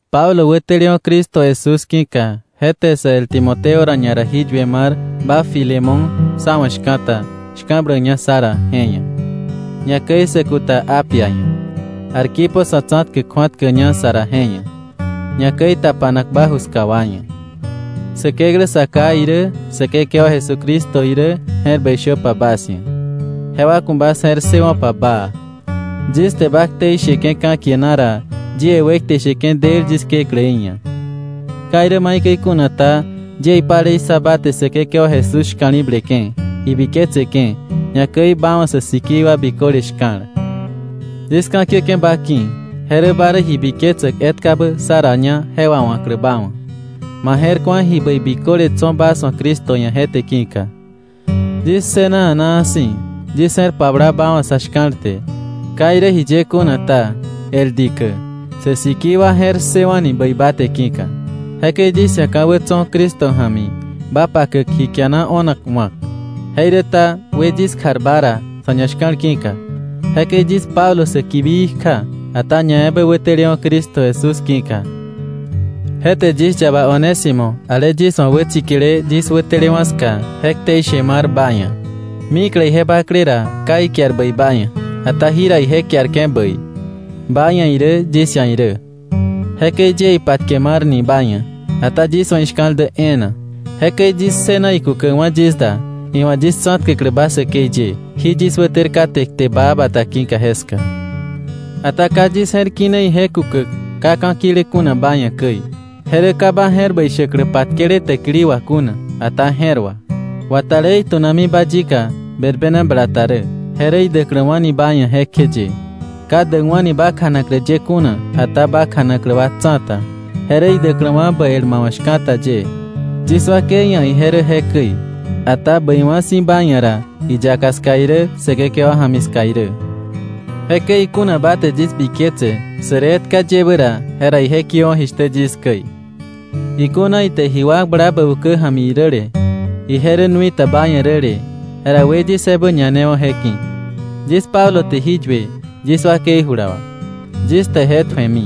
Pablo wätelewa̱ Cristo Jesús ki̱ka, je te sä el Timoteo ra ñara jí yue mar ba Filemón sá wa̱ shka̱ta, shka̱bläkña sá ra je ia̱, ñakäi sä kuta Apia ia̱, Arquipo sa̱ tsa̱tkäk kju̱atkäkña sa ra je ia̱, ñakäi tapanak ba ju ska wa ia̱. Säkeklä Sa Ká irä, Säkekewa Jesucristo irä, je̱r bäi shöpa bas ia̱, jewa ku̱ bas je̱r ssëwo̱pa baa. Yis te ba ktei sheke̱ ka̱kie na ra, yie wekte sheke̱ del yis Kekläí ia̱. Ka irä maikäi kuna ta, yie ipalei ssa ba te Säkekewa Jesús shka̱li̱bleke̱, ibiketseke̱, ñakäi ba wa̱ sä sikii wa biköle shka̱l. Yis ka̱kiäke̱ ba ki̱, je rä ba rä ji biketsäk etkabä sá raña je wawa̱klä ba wa̱, ma je̱r ku̱a ji bäi biköle tso̱ bas wa̱ Cristo ia̱ je te ki̱ka. Yis ssëna a̱naa si̱, yis je̱r pabla ba wa̱ sa̱ shka̱l te. Ka irä jiye kuna ta, el dikä, sä sikii wa je̱r ssëwa̱ni bäi ba te ki̱ka. Jekäi yis ia̱ ka̱wä tso̱ Cristo ja̱mi ba pakäk ji kiana o̱nak wa̱k, jeiräta, wë yis kjar ba ra sa̱ ñashka̱l ki̱ka. Jekäi yis Pablo säkibii kja, ata ñaebä wätelewa̱ Cristo Jesús ki̱ka, je te yis yaba Onésimo ale yis wa̱ wätsikile yis wätelewa̱ ska, je ktei she mar ba ia̱. Mikle ije bakle ra ka ikiar bäi ba ia̱. Ata jira ije kiarke̱ bäi, ba ia̱ irä yis ia̱ irä. Jekäi yie ipatke marni ba ia̱, ata yis wa̱ ishka̱l dä e̱e̱na. Jekäi yis ssëna ikukäkwa̱ yis da, iwa̱ yis tsa̱tkäklä ba säkei ye jí yis wäter kate kte baa ki̱ka jeska. Ata ka yis je̱r kine ije kukäk ka ka̱ kile kuna ba ia̱ käi. Je rä ka ba je̱r bäi shäklä patkele täkili wà kuna, ata je̱r wà. Watalé itu̱nami ba yika berbena bala ta rä, je rä idäkläwa̱ni ba ia̱ jekjeye, ka däkwa̱ni ba kjanaklä ye kuna, ata ba kjanaklä wa tsa̱ta, je rä idäkläwa̱ bä el ma wa̱ shka̱ta ye. Yis wakei ia̱ ije rä jekäi, ata bäiwa̱ si̱ ba ia̱ ra, iyaka ska irä Säkekewa ja̱mi ska irä. Jekäi ikuna ba te yis biketse sä rä etka yebä ra, jera ije kiöwa̱ jishtä yis käi. Ikuna ite ji wakbla bä ukä ja̱mi räle, ije rä nui ta ba ia̱ räle, jera we yis ebä ñanewo̱ je ki̱. Yis Pablo te jí yue yis wakei jula wà, yis te je tju̱emi.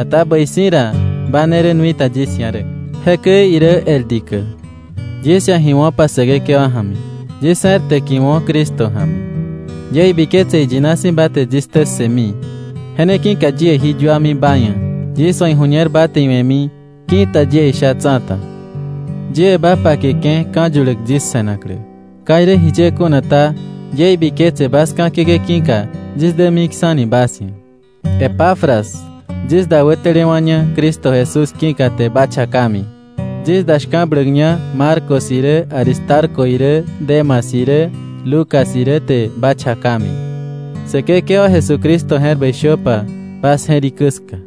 Ata bäi si̱ ra, ba ne rä nui ta yis ia̱ rä. Jekäi irä el dikä, yis ia̱ ji wo̱pa Säkekewa ja̱mi; yis je̱r täkiwo̱ Cristo ja̱mi. Yie ibiketse iyina si̱ ba te yis ktä ssëmi. Je ne ki̱ka yie jí yuami ba ia̱, yis wa̱ iju̱ñer ba te iwe̱mi ki̱ta yie isha tsa̱ta. Yie ba pakeke̱ ka̱ yuläk yis se̱naklä. Ka irä jiye kuna ta, yie ibiketse bas ka̱kiäke̱ ki̱ka yis dämiksa̱ni bas ia̱. Epafras, yis da wätelewa̱ña Cristo Jesús ki̱ka te ba chakami. Yis da shka̱bläkña Marcos irä Aristarco irä Demas irä, Lucas irä te ba chakami. Säkekewa Jesucristo je̱r bäi shöpa bas jerikä ska.